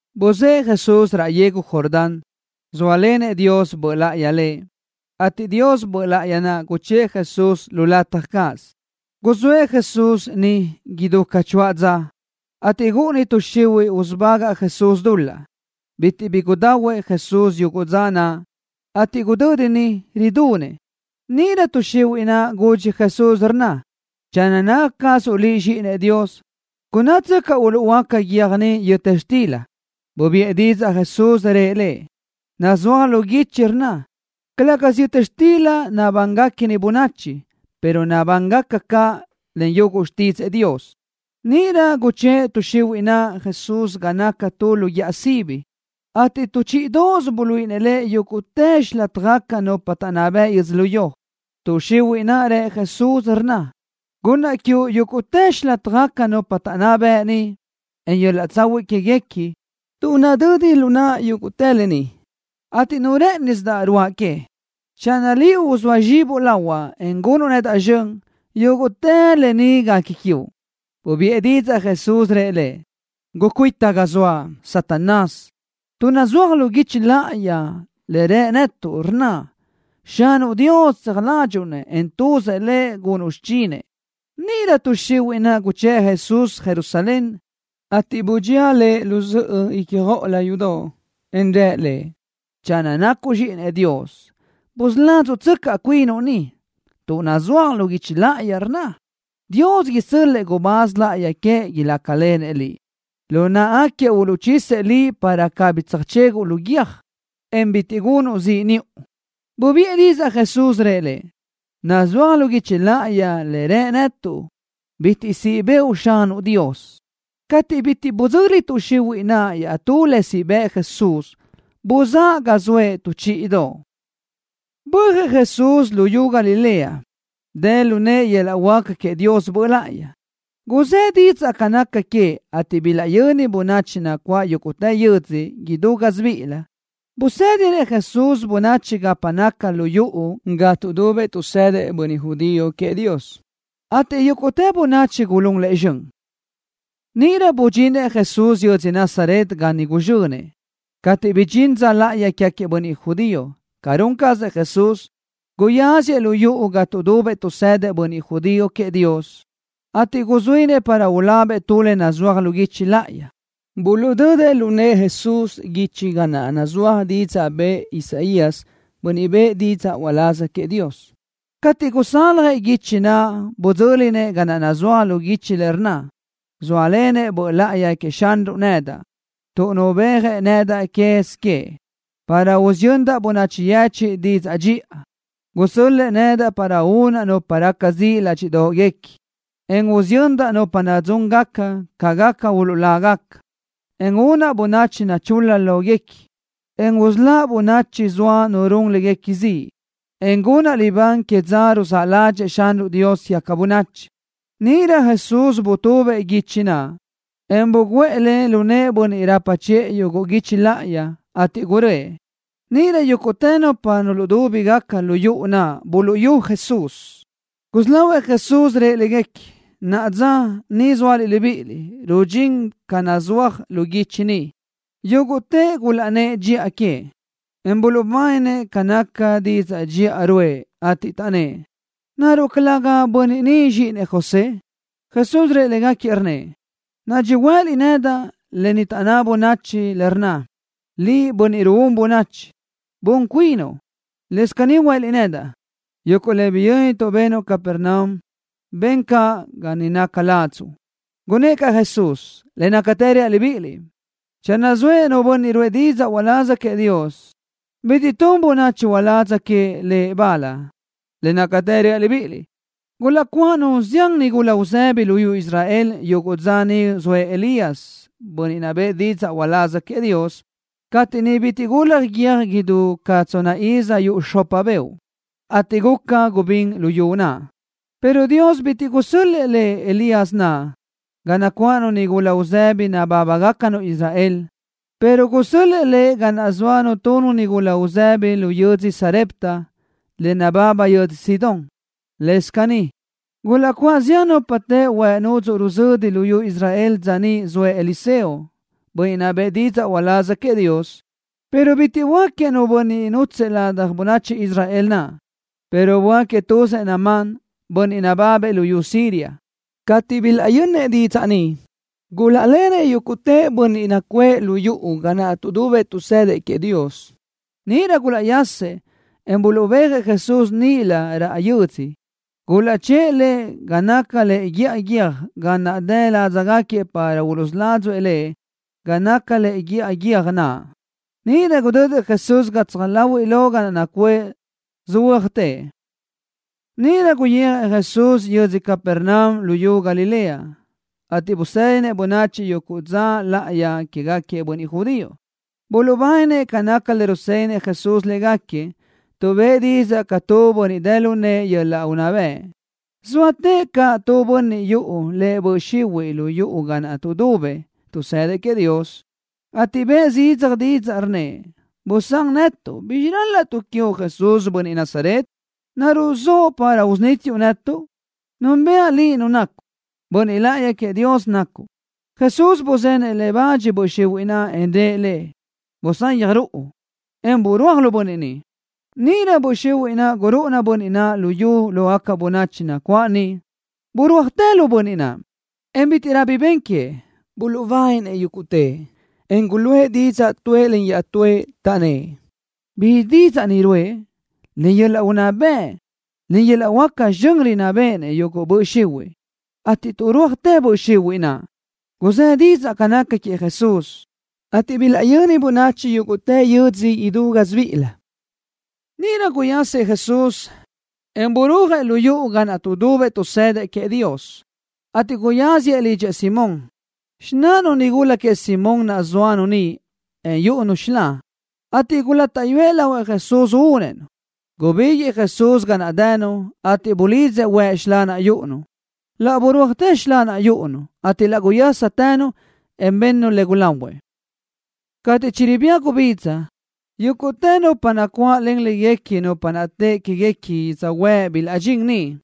Buzë́ʼë Jesús raʼ yegu Jordán, zóalenëʼ Dios Böʼ Láʼayi Lëʼ, ateʼ Dios Böʼ Láʼayi naʼ guchë́ʼë Jesús lu lataj cáʼasö. Guzóëʼ Jesús niʼ idú ca choáʼ dza, ateʼ gúʼuni tuʼ xihuiʼ usubagaʼ Jesús dul-laʼ. Bitiʼ bi gudahuëʼ Jesús yuguʼ dza naʼ, ateʼ gudödi niʼ ridunëʼ. Níʼirö tuʼ xihuiʼ naʼ gudxi Jesús, rnna: —Channö naca cazuʼ Liʼ Zxíʼinëʼ Dios, gunnátsöcaʼ uluʼhuöáca guiö́j ni yöta xtila. Bubiʼë didzaʼ Jesús, rëʼ le: —Nazúaj lu guichi, rnna: “Calë́gasö yöta xtila nabánigaca bönachi, pero nabánigaca caʼ yúguʼtë xtídzëʼë Dios.” Níʼirö guchë́ʼ tuʼ xihuiʼ naʼ Jesús ga naca tu lu guíʼa sibi ateʼ tu chíʼidoʼosö buluíʼi Lëʼ yúguʼtë xilátjagaca nupa taʼnná bëʼ yödzölió. Tuʼ xihuiʼ naʼ rë Jesús, rnna: —Gunnaʼ quiuʼ yúguʼtë xilátjagaca nupa taʼnná bëʼ ni, en yöl-laʼ tsahuiʼ quéguequi, tuʼ nadödi lu naʼa yúguʼtë lë ni, ateʼ nu rë́ʼënisidaʼ ruáʼa que. Channö Liʼ uzóa zxibuʼ lahuaʼ, en gunuʼ nedaʼ zxön, yúguʼtë lë ni guequi quiuʼ. Bubiʼë didzaʼ Jesús, rëʼ le: —Gucuita ga zoaʼ, Satanás, tuʼ nazúaj lu guichi láʼayi le rë netuʼ, rnna: “Xanuʼ Dios tseaj ládxuʼu-nëʼ, en tuzëʼ Lëʼ gunuʼ xichinëʼ.” Níʼirö tuʼ xihuiʼ naʼ guchë́ʼ Jesús Jerusalén, ateʼ budxía Lëʼ lu zöʼö ícjoʼolö yudoʼ, en rë Lëʼ: —Channö nacuʼ Zxíʼinëʼ Dios, busuládzuʼtsöcaʼ cuinuʼ ni tuʼ nazúaj lu guichi láʼayi, rnna: Dios isö́l-lëʼë gubáz láʼayi queëʼ, ilácalenëʼ Liʼ. Lu náʼagaquiëʼ uluʼchisëʼ Liʼ para cabí tsöjchéguʼu guiö́j, en bitiʼ gunuʼ ziʼ niʼu. Bubiʼë didzaʼ Jesús, rëʼ le: —Nazúaj lu guichi láʼayi le rë netuʼ: “Bitiʼ siʼ bëʼu Xanuʼ Dios.” Cateʼ bitiʼ budzöli tuʼ xihuiʼ naʼ iaʼtú le siʼ bëʼ Jesús, buzáʼ ga zoëʼ tu chíʼidoʼ. Bö́ajëʼ Jesús luyú Galilea, dë lu nëʼë yöl-laʼ huáca queëʼ Dios Böʼ Láʼayi. Guzë́ didzaʼ ca naca queëʼ, ateʼ bilaʼyöni bönachi nacuáʼ yúguʼtë yödzö idú gásibiʼilö. Busédinëʼ Jesús bönachi gapa naca lu yuʼu ga tuʼdubëʼ tuʼsëdëʼ bönniʼ judío queëʼ Dios, ateʼ yúguʼtë bönachi gulún Lëʼ zxön. Níʼirö budxinëʼ Jesús yödzö Nazaret ga niʼ guzxönëʼ. Cateʼ bidxín dza láʼayi quégaquiëʼ bönniʼ judío, ca run cazëʼ Jesús, guyáziëʼ lu yuʼu ga tuʼdubëʼ tuʼsëdëʼ bönniʼ judío queëʼ Dios, ateʼ guzuínëʼ para ulabëʼ tu le nazúaj lu guichi láʼayi. Buluʼdödëʼ lu nëʼë Jesús guichi ga naʼ nazúaj didzaʼ bëʼë Isaías, bönniʼ bëʼë didzaʼ uláz queëʼ Dios. Cateʼ gusaljëʼ guichi naʼ, budzö́linëʼ ga nazúaj lu guichi le rnna: Zóalenëʼ Böʼ Láʼayi queëʼ Xanruʼ nedaʼ tuʼ nubéajëʼ nedaʼ quez queëʼ para usiyöndaʼ bönachi yechiʼ didzaʼ dxiʼa. Gusö́l-lëʼë nedaʼ para unaʼ nupa raca ziʼ ládxiʼdoʼguequi, en usiyöndaʼ nupa nadzúngaca, ca gaca uluʼlágaca, en únaʼ bönachi nachul-la lóguequi, en usöláʼ bönachi zoa nu run léguequi ziʼ, en gunaʼ libán que dza ruzáʼ ládxëʼë Xanruʼ Dios quégaca bönachi. Níʼirö butubëʼ Jesús guichi naʼ, en buguʼë le lu nëʼë bönniʼ rapa chiʼë yuguʼ guichi láʼayi, ateʼ guröʼë. Níʼirö yúguʼtë nupa nudúbigaca lu yuʼu naʼ gulaʼnáʼ Jesús. Gusí lahuëʼ Jesús rëʼ légaquiëʼ: —Naʼa dza ni zóaliʼ libíʼiliʼ, rudxín caz le nazúaj lu guichi ni. Yúguʼtëʼ gulaʼnnë́ʼ dxiʼa queëʼ, en buluʼbáninëʼ ca naca didzaʼ dxiʼa ruʼë, ateʼ taʼnnë́ʼ: —¿Naruʼ calëga bönniʼ ni zxíʼinëʼ José? Jesús rëʼ légaquiëʼ, rnnëʼ: —Nadxi huëliʼ nedaʼ lë ni taʼnná bönachi, le rnna: “Liʼ, bönniʼ ruún bönachi, bun cuinuʼ.” Lëscaʼ caní huëliʼ nedaʼ: “Yuguʼ le biyö́nituʼ benuʼ Capernaum, ben caʼ ga ni naca ladzuʼ.” Gunnë́ʼ caʼ Jesús: —Le nácatë reaʼ libíʼiliʼ, channö zoëʼ nu bönniʼ ruʼë didzaʼ uláz queëʼ Dios, bitiʼ tun bönachi uládz queëʼ lëʼ bal. Le nácatë reaʼ libíʼiliʼ, gulaʼcuáʼanu zián nigula uzëbi luyú Israel yuguʼ dza niʼ zoëʼ Elías, bönniʼ bëʼë didzaʼ uláz queëʼ Dios, cateʼ niʼ bitiʼ gulaj guiö́j idú ca tsonna iz yuʼ xopa beoʼ, ateʼ guca gubín luyú naʼ, pero Dios bitiʼ gusö́l-lëʼë Elías naʼ ga nacuáʼanu nigula uzëbi nabábagacanu Israel, pero gusö́l-lëʼë lëʼ ga naʼ zóanu tu nigula uzëbi lu yödzö Sarepta, le nababa yödzö Sidón. Lëscaʼ caní, gulaʼcuáʼ zián nupa teʼe huëʼ nudzuʼ ruzödi luyú Israel dza niʼ zoëʼ Eliseo, bönniʼ bëʼë didzaʼ uláz queëʼ Dios, pero bitiʼ böáquiëʼ nu bönniʼ nútsëʼë ladaj bönachi Israel naʼ, pero böáquiëʼ tuzëʼ Naamán, bönniʼ nababëʼ luyú Siria. Cateʼ bilaʼyönnëʼ didzaʼ ni, gulaʼlenëʼ yúguʼtë bönniʼ nacuʼë lu yuʼu ga naʼ tuʼdubëʼ tuʼsëdëʼ queëʼ Dios. Níʼirö gulaʼyasëʼ, en buluʼbéajëʼ Jesús níʼilö raʼ yödzö. Gulaʼchë́ʼë Lëʼ ga naca lëʼe guíʼa guiö́j ga naʼ dë ládzagaquiëʼ para uluʼsuládzuëʼ Lëʼ ga naca lëʼe guíʼa guiö́j naʼ. Níʼirö gudödëʼ Jesús gatsaj láhuiʼlö ga naʼ nacuʼë, söhuö́ajtëʼ. Níʼirö guyijëʼ Jesús yödzö Capernaum luyú Galilea, ateʼ busédinëʼ bönachi yuguʼ dza láʼayi quégaquiëʼ bönniʼ judío. Buluʼbáninëʼ ca naca le rusédinëʼ Jesús légaquiëʼ, tuʼ bëʼë didzaʼ ca tu bönniʼ dë lu nëʼë yöl-laʼ unná bëʼ. Zóatëʼ caʼ tu bönniʼ yuʼu lëʼ böʼ xihuiʼ lu yuʼu ga naʼ tuʼdubëʼ tuʼsëdëʼ queëʼ Dios, ateʼ bëʼë zidzaj didzaʼ, rnnëʼ: —¡Busán netuʼ! ¿Bizxi rálaʼtuʼ quiuʼ, Jesús, bönniʼ Nazaret? ¿Naruʼ zoʼo para usunítiuʼ netuʼ? Núnbëʼa Liʼ Nu nacuʼ. Bönniʼ Láʼayi queëʼ Dios nacuʼ. Jesús buzenëʼ le bach böʼ xihuiʼ naʼ, en rëʼ le: —Busayaj ruʼu, en burúaj lu bönniʼ ni. Níʼirö böʼ xihuiʼ naʼ gurúʼuna bönniʼ naʼ lu yu lógaca bönachi nacuáʼ niʼ. Burúajtë lu bönniʼ naʼ, en bítiʼrö bi ben queëʼ. Buluʼbáninëʼ yúguʼtëʼ, en guluʼë didzaʼ tuëʼ len iaʼtúëʼ, taʼnnë́ʼ: —¿Bizxi didzaʼ ni ruʼë? Len yöl-laʼ unná bëʼ, en yöl-laʼ huáca zxön rinná béʼenëʼ yuguʼ böʼ xihuiʼ, ateʼ tuʼrúajtë böʼ xihuiʼ naʼ. Guzë́ didzaʼ ca naca queëʼ Jesús, ateʼ bilaʼyöni bönachi yúguʼtë yödzö idú gásibiʼilö. Níʼirö guyasëʼ Jesús, en burúajëʼ lu yuʼu ga naʼ tuʼdubëʼ tuʼsëdëʼ queëʼ Dios, ateʼ guyáziëʼ lidxëʼ Simón. Xináʼanu nigula queëʼ Simón naʼ zóanu niʼ, en yúʼunu xilá, ateʼ gulátaʼyuëʼ lahuëʼ Jesús únëʼ-nu. Gubíguiʼë Jesús ga naʼ dënu, ateʼ bulidzëʼ huëʼ xilá naʼ yúʼunu. Laʼ birúajtë xilá naʼ yúʼunu, ateʼ laʼ guyástënu, en bë́ʼënu le gulahuëʼ. Cateʼ chiribía gubidza, yúguʼtë nupa nacuáʼlen léguequi nupa naʼ teʼe que queë́guequi yödzhuë́ʼ bilaʼdxín niʼ,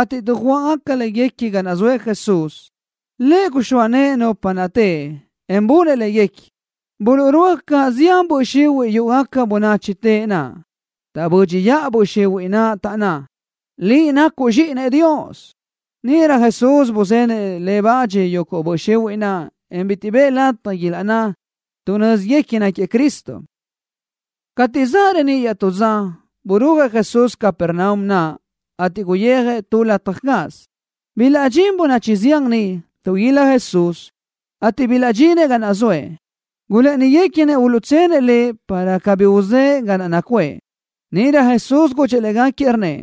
ateʼ dujuáʼgaca léguequi ga naʼ zoëʼ Jesús. Lëʼ guxóa nëʼë nupa naʼ teʼe, en bunëʼ léguequi. Buluʼrúaj caʼ zián böʼ xihuiʼ yúʼugaca bönachi teʼe naʼ. Taʼbö́dxiʼa böʼ xihuiʼ naʼ, taʼnná: —Liʼ nacuʼ zxíʼinëʼ Dios. Níʼirö Jesús buzenëʼ le bach yuguʼ böʼ xihuiʼ naʼ, en bitiʼ bëʼë lataj ilaʼnná, tuʼ nö́ziguequi náquiëʼ Cristo. Cateʼ zaʼ reníʼ iaʼtú dza, burúajëʼ Jesús Capernaum naʼ, ateʼ guyijëʼ tu lataj cáʼasö. Bilaʼdxín bönachi zián niʼ, tuʼguílaj Jesús. Cateʼ bilaʼdxinëʼ ga naʼ zoëʼ, gulë́ʼëniguequinëʼ uluʼtsenëʼ Lëʼ, para cabí uzë́ʼë ga naʼ nacuʼë. Níʼirö Jesús gudxëʼ légaquiëʼ, rnnëʼ: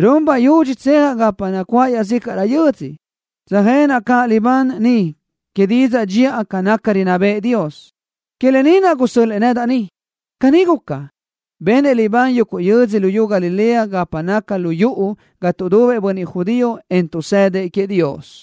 —Run bayudxi tsejaʼ gapa nacuáʼ iaʼzícaʼrö yödzö, tsöjenaʼ caʼ libán niʼ que didzaʼ dxiʼa ca rinná bëʼë Dios. Que lë ni naʼ gusö́l-lëʼë nedaʼ ni. Caní guca, benëʼ libán yuguʼ yödzö luyú Galilea gapa naca lu yuʼu ga tuʼdubëʼ bönniʼ judío, en tuʼsëdëʼ queëʼ Dios.